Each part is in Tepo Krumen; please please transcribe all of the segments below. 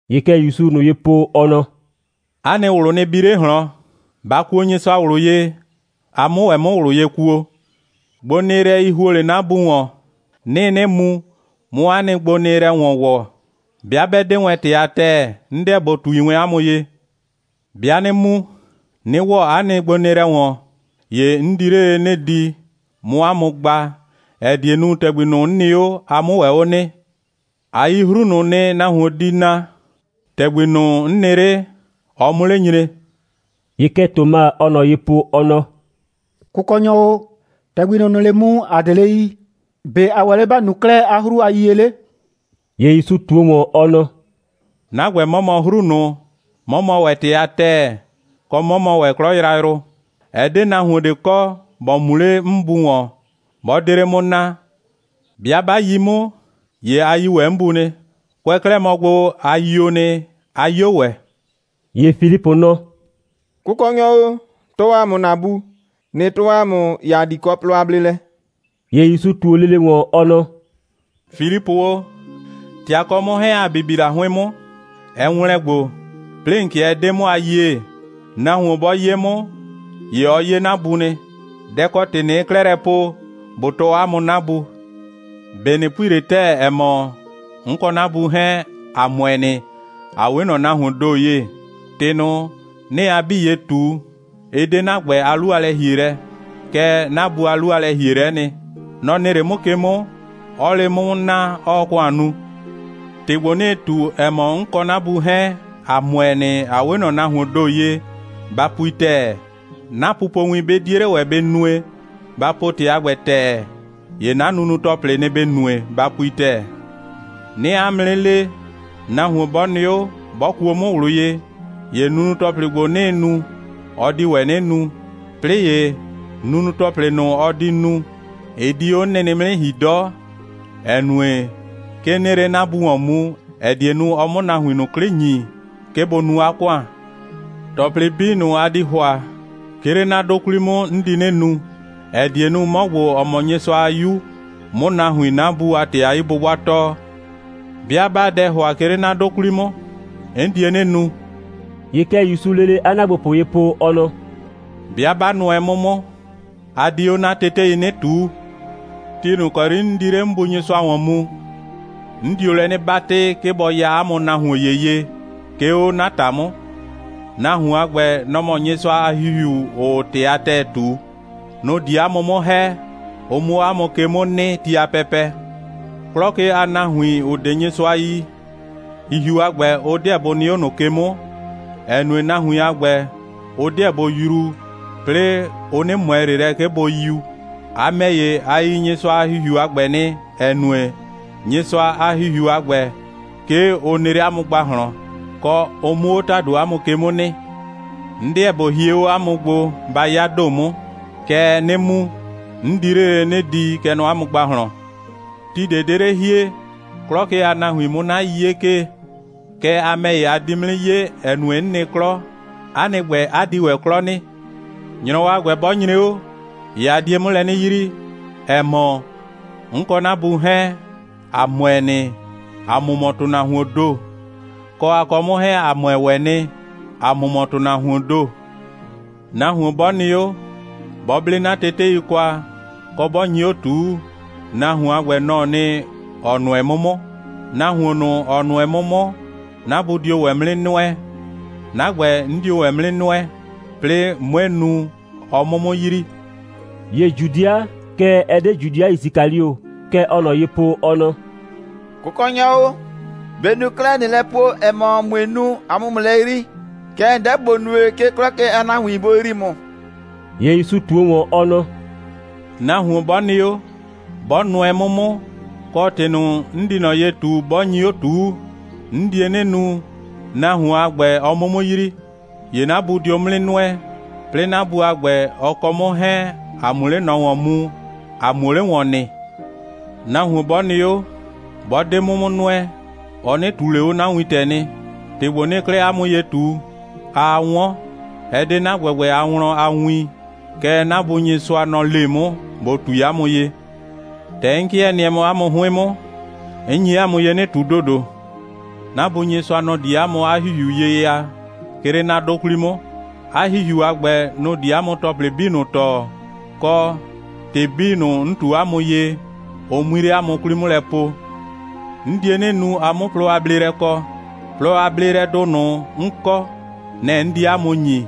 ‑Ye kɛ ‑Yusuu ꞊nʋ ye po, ɔ nɔ: «'A nɩ ꞊wlʋ nɩ bi 'le ꞊hlɔn. Ba kuo Nyɩsʋa ꞊wlʋ ye, a 'mʋ ‑wɛ 'mʋ ꞊wlʋ ye kuo. Gbonɩɩlɛi ‑huo 'le 'na Bu ‑wɔn. 'Nɩɩ 'nɩ mu, 'mʋ 'a nɩ gbonɩɩlɛ ‑wɔn ‑wɔ. 'Bɩa 'bɛ 'de wɛn ‑tɩ a ‑tɛɛ, 'n 'deɛ ꞊bo ꞊tui wɛn 'a mʋ ye. 'Bɩa 'nɩ mu, 'nɩ ‑wɔ 'a nɩ gbonɩɩlɛ ‑wɔn, ‑ye 'n di 'le lele 'nɩ di, 'mʋ 'a mʋ gba, ‑ɛ die nu, ‑tɛgbi ꞊nʋ, 'n nɩ 'o, a 'mʋ ‑wɛ 'o nɩ. A yi 'hru ꞊nʋ nɩ, nahuon di na, ‑tɛgbi ꞊nʋ, 'n nɩ 'le, ɔ 'mʋ 'le nyre.» ‑Ye kɛ Toma, ɔɔ ꞊nɔ ye po, ɔ nɔ: «Kʋkɔnyɔ o, ‑tɛgbi ꞊nʋ, ‑nɩɩ 'le mu, ‑a 'de 'le yii. ‑Be' ‑a ‑wɛ 'le ‑ba nu 'klɛɛ 'a 'hru a yiyie 'le?» ‑Ye ‑Yusu ꞊tuo ‑wɔn, ɔ nɔ: «'Na ‑gbɛ, 'mɔ mɔ 'hru ꞊nʋ, 'mɔ mɔ ‑wɛ ‑tɩ a ‑tɛɛ, kɔ, 'mɔ mɔ ‑wɛ 'klɔ yrayrʋ. Ɛ 'de nahuon ꞊de kɔ, ‑bɔ mu 'le 'n Bu ‑wɔn, ‑bɔ 'de 'le 'mʋ naa. 'Bɩa 'ba yi 'mʋ, ‑ye a yi ‑wɛ 'n Bu nɩ. Kʋɛ 'klɛɛ mɔ gbo, a yio nɩ, 'a 'yo ‑wɛ.» ‑Ye Filipʋ nɔ: «Kʋkɔnyɔ o, tɔɔ ‑a mʋ ‑na Bu. ꞊Nɩ tʋɔ ‑a mʋ, ‑ye ‑a di kɔ plɔ a bleelɛ.» ‑Ye ‑Yusu ꞊tuo lele ‑wɔn, ɔ nɔ: «Filipʋ o, ‑tɛ a kɔ 'mʋ 'hɛɛn, ‑a bibi la 'hʋɩn 'mʋ, ɛ ‑wlɛn gbo, 'plɩɩ ‑n 'kɩɛ 'dee 'mʋ a yie. Nahuon 'bɔ 'ye 'mʋ, ‑ye ɔ 'ye 'na Bu nɩ. Dɛ‑ kɔ ‑tɩ ꞊nɩɩ 'klɛɛ lɛ po, ꞊bo tɔɔ 'a mʋ 'na Bu? ꞊Be ꞊nɩ pui ꞊le ‑tɛɛ, ‑ɛ mɔ, 'n kɔ 'na Bu 'hɛɛn, ‑a ‑mʋɛ nɩ, ‑a 'we ꞊nɔ nahuoon ‑do ye? ‑Tɩ ꞊nʋ, 'nɩɩ a 'bii ye ꞊tu, ɩ 'de 'na ‑gbɛ a 'lu a lɛ‑hielɛ, kɛɛ, 'na Bu a 'lu a lɛ‑hielɛ'ɛ nɩ. Nɔ‑ nɩ 'le 'mʋ ke 'mʋ, 'ɔɔ 'le 'mʋ 'mʋ naa, 'ɔɔ ‑kʋan nu. ‑Tɩ ‑gbo, 'nɩɩ ꞊tu, ‑ɛ mɔ, 'n kɔ 'na Bu 'hɛɛn, ‑a ‑mʋɛ nɩ, ‑a 'we ꞊nɔ nahuoon ‑do ye, ba pui ‑tɛɛ. 'Na pupowin, 'bɩ 'die 'le ‑wɛ bɩ nue, ba po ‑tɩ a ‑gbɛ ‑tɛɛ, ‑ye 'na nunu‑tɔplɩ, nɩ‑ ‑bɩ nue, ba pui ‑tɛɛ. 'Nɩɩ 'a mʋ 'nɩ le, nahuon 'bɔ nɩ 'o, 'bɔ kuo 'mʋ ꞊wlʋ ye, ‑ye nunu‑tɔplɩ ‑gbo, 'nɩɩ nu, ɔ di ‑wɛ 'nɩ nu. 'Plɩɩ ‑ye, nunu‑tɔplɩ ꞊nʋ, ɔ di nu, ɩ di 'o 'n nɩnɩ 'mʋ 'nɩ ‑hi 'dɔ, ‑ɛ nue, 'ke 'nɩɩ 'le 'na Bu ‑wɔn mu, ‑ɛ die nu, ɔ 'mʋ 'na nahuin ꞊nʋ 'klɩ ‑nyi, 'ke bʋ nu 'a ‑kʋan. ‑Tɔplɩ 'bii ꞊nʋ, a di ‑hʋa, 'ke 'le 'na 'dʋ 'kwli 'mʋ, 'n di 'nɩ nu, ‑ɛ die nu, 'mɔ ‑gbo, ‑ɔ mɔ Nyɩsʋa a 'Yu, 'mʋ nahuin 'na Bu a ‑tɩ a 'yi'bʋbʋa tɔɔ. 'Bɩa 'baa dɛ ‑hʋa, 'ke 'le 'na 'dʋ 'kwli 'mʋ, 'n die 'nɩ nu.» ‑Ye kɛ ‑Yusuu lele 'a ‑naagbopʋ ye po, ɔ nɔ: «'Bɩa 'ba nʋɛ 'mʋ 'mʋ, a di 'o 'na tetei 'nɩ ꞊tuu. Ti ꞊nʋ ‑kɔ 'yri 'n di 'le 'n Bu Nyɩsʋa ‑wɔn mu, 'n dio lɛ 'nɩ 'batɩ, 'ke bɔ ya 'a mʋ nahuon ‑ye ye, 'ke 'o 'na ‑ta 'mʋ. Nahuon a ‑gbɛ, nɔ‑ mɔ Nyɩsʋa a ‑Hihiu, ‑ʋʋ ‑tɩ a ‑tɛɛ ꞊tu. Nʋ‑ di 'a mʋ 'mʋ ‑hɛ, ʋ 'mʋ 'o 'a mʋ ke 'mʋ nɩ ti a pɛpɛ. 'Klɔ ke a nahuin, ‑ʋ 'de Nyɩsʋa yi, ‑Hihiu a ‑gbɛ, ʋ 'deɛ bʋ nɩ 'o ꞊nʋ ke 'mʋ, ‑ɛ nue, nahuin a ‑gbɛ, ʋ 'dɩɛ bʋ yruu, 'plɩɩ ʋ 'nɩ ꞊mʋɛ ꞊le lɛ, 'ke bʋ yiu. A ‑mɛ ‑ye, a yi Nyɩsʋa a ‑Hihiu a ‑gbɛ nɩ, ‑ɛ nue, Nyɩsʋa a ‑Hihiu a ‑gbɛ, 'ke ʋ nɩ 'le 'a mʋ ‑gbahlɔn, kɔ, ʋ 'mʋ 'o ‑tado 'a mʋ ke 'mʋ nɩ. 'N 'deɛ ꞊bo hie 'o 'a mʋ gbo, ba 'ya ‑do 'mʋ. Kɛɛ, 'nɩ mu, 'n di 'le lele 'nɩ di, kɛ nɔ 'a mʋ ‑gbahlɔn. Ti ꞊de 'de 'le hie, 'klɔ ke a nahuin 'mʋ 'na 'yiye 'kee. Kɛɛ, a ‑mɛ ‑ye, a di 'mʋ 'nɩ 'ye, ‑ɛ nue, 'n nɩ 'klɔ, 'a nɩ ‑gbɛ, 'a di ‑wɛ 'klɔ nɩ. ‑Nyrɔwɔ a ‑gbɛ 'bɔ nyre 'o, ‑ye a die 'mʋ lɛ 'nɩ yrii, ‑ɛ mɔ, 'n kɔ 'na Bu 'hɛɛn, ‑a ‑mʋɛ nɩ, ‑a mʋ mɔ ‑tʋnahuoon ‑do, kɔ, a kɔ 'mʋ 'hɛɛn, ‑a ‑mʋɛ ‑wɛ nɩ, ‑a mʋ mɔ ‑tʋnahuoon ‑do. Nahuon 'bɔ nɩ 'o, 'bɔ 'ble 'na tetei kwa, kɔ, 'bɔ nyi 'o ꞊tuu, nahuon a ‑gbɛ, nɔ‑ɔ nɩ, ‑ɔ nʋɛ 'mʋ 'mʋ. Nahuon ꞊nʋ, ‑ɔ nʋɛ 'mʋ 'mʋ, 'na Bu dio ‑wɛ 'mʋ 'nɩ nʋɛ. 'Na ‑gbɛ, 'n dio ‑wɛ 'mʋ 'nɩ nʋɛ, 'plɩɩ 'mue nu, ɔ 'mʋ 'mʋ yrii.» ‑Ye Judɩa, kɛɛ, ɛ 'de Judɩa Yisikalio, kɛ ɔɔ ꞊nɔ ye po, ɔ nɔ: «Kʋkɔnyɔ o, ‑be' ‑n nu 'klɛɛ, ꞊nɩɩ lɛ po, ‑ɛ mɔ, ꞊mue nu, ‑a 'mʋ ‑mʋ yrii, kɛɛ, ‑n 'deɛ ‑bo nue, 'ke 'klɔ ke a nahuin bʋ yrii ‑mʋ?» ‑Ye ‑Yusu ꞊tuo ‑wɔn, ɔ nɔ: «Nahuon 'bɔ nɩ 'o, 'bɔ nʋɛ 'mʋ 'mʋ, kɔ, ‑tɩ ꞊nʋ, 'n di ꞊nɔ ye ꞊tu, 'bɔ nyi 'o ꞊tuu, 'n die 'nɩ nu, nahuon a ‑gbɛ, ɔ 'mʋ 'mʋ yrii. ‑Ye 'na Bu dio 'mʋ 'nɩ nʋɛ, 'plɩɩ 'na Bu a ‑gbɛ, ɔ kɔ 'mʋ 'hɛɛn, ‑a 'mʋ 'le ꞊nɔ ‑wɔn mu, ‑a 'muo 'le ‑wɔn nɩ. Nahuon, 'bɔ nɩ 'o, 'bɔ 'de 'mʋ 'mʋ nʋɛ, ɔ 'nɩ ꞊tuu ꞊le 'o 'na wintɛ nɩ. ‑Tɩ ‑gbo, 'nɩɩ 'klɛɛ 'a mʋ ye ꞊tu, aa 'wɔn, ɛ 'de 'na ‑gbɛgbɛ a wlɔn a win, kɛɛ, 'na Bu Nyɩsʋa, nɔ‑ le 'mʋ, ꞊bo ꞊tui 'a mʋ ye. ‑Tɛ 'n 'kɩɛ nɩɛ mɔ 'a mʋ 'hʋɩn 'mʋ, 'n nyi 'a mʋ ye 'nɩ ꞊tu ‑dodo. 'Na Bu Nyɩsʋa, nɔ‑ di 'a mʋ 'a ‑Hihiu ye ya, 'ke 'le 'na 'dʋ 'kwli 'mʋ. 'A ‑Hihiu a ‑gbɛ, nʋ‑ di 'a mʋ ‑tɔplɩ 'bii tɔɔ, kɔ, ‑tɩ 'bii ꞊nʋ, 'n ꞊tu 'a mʋ ye, ʋ 'mui 'le 'a mʋ 'kwli 'mʋ lɛ po. 'N die 'nɩ nu, a 'mʋ plɔ a bleelɛ kɔ. Plɔ a bleelɛdʋ ꞊nʋ, 'n kɔ, nɛ‑ 'n di 'a mʋ ‑nyi.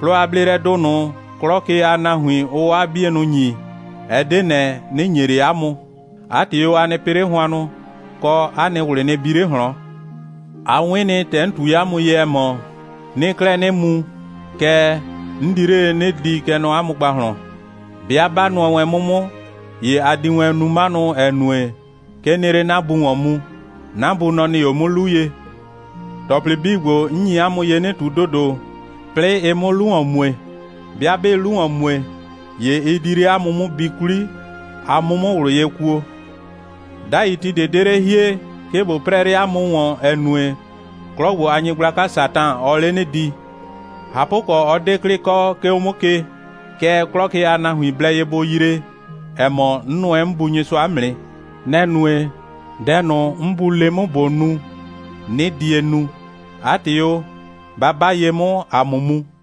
Plɔ a bleelɛdʋ ꞊nʋ, 'klɔ ke a nahuin, ʋʋ 'waa 'bienʋ ‑nyi, ɛ 'de ꞊nɛ, 'nɩ ‑nye ꞊le 'a mʋ. 'A ‑tɩ o, a nɩ pɩ 'le hʋannʋ, kɔ, 'a nɩ ꞊wlɩ nɩ bi 'le ꞊hlɔn. A 'wɩn nɩ, ‑tɛ 'n ꞊tui 'a mʋ ye, ‑ɛ mɔ: 'Nɩɩ 'klɛɛ 'nɩ mu, kɛɛ, 'n di 'le lele 'nɩ di, kɛ nɔ 'a mʋ ‑gbahlɔn. 'Bɩa 'ba nʋɛ wɛn 'mʋ 'mʋ, ‑ye a di wɛn nu 'manʋ, ‑ɛ nue, 'ke 'nɩɩ 'le 'na Bu ‑wɔn mu. 'Na Bu, nɔ‑ nɩ 'o 'mʋ 'lu ye. ‑Tɔplɩ 'bii ‑gbo, 'n nyi 'a mʋ ye 'nɩ ꞊tu ‑dodo, 'plɩɩ ɩ 'mʋ 'lu ‑wɔn mue. 'Bɩa 'bɩɩ 'lu ‑wɔn mue, ‑ye ɩ di 'le 'a mʋ 'mʋ bi 'kwli, a 'mʋ 'mʋ ꞊wlʋ ye kuo. 'Dai ti ꞊de 'de 'le hie, 'ke ꞊bo 'prɛɛ 'le 'a mʋ ‑wɔn, ‑ɛ nue, 'klɔ ‑gbo a nyɩgblaka Satan, ɔɔ 'le 'nɩ di. ꞊Hapʋkɔ, 'ɔ 'de 'klɩ kɔ, 'ke 'o 'mʋ ke, kɛɛ, 'klɔ ke a nahuin blɛ ye bʋ yree, ‑ɛ mɔ, 'n nʋɛ 'n Bu Nyɩsʋa 'mʋ nɩ. Nɛ‑ nue, dɛ ꞊nʋ, 'n Bu le 'mʋ, ꞊bo nu, 'nɩ die nu. 'A ‑tɩ o, ba 'ba ye 'mʋ, ‑a 'mʋ mu.»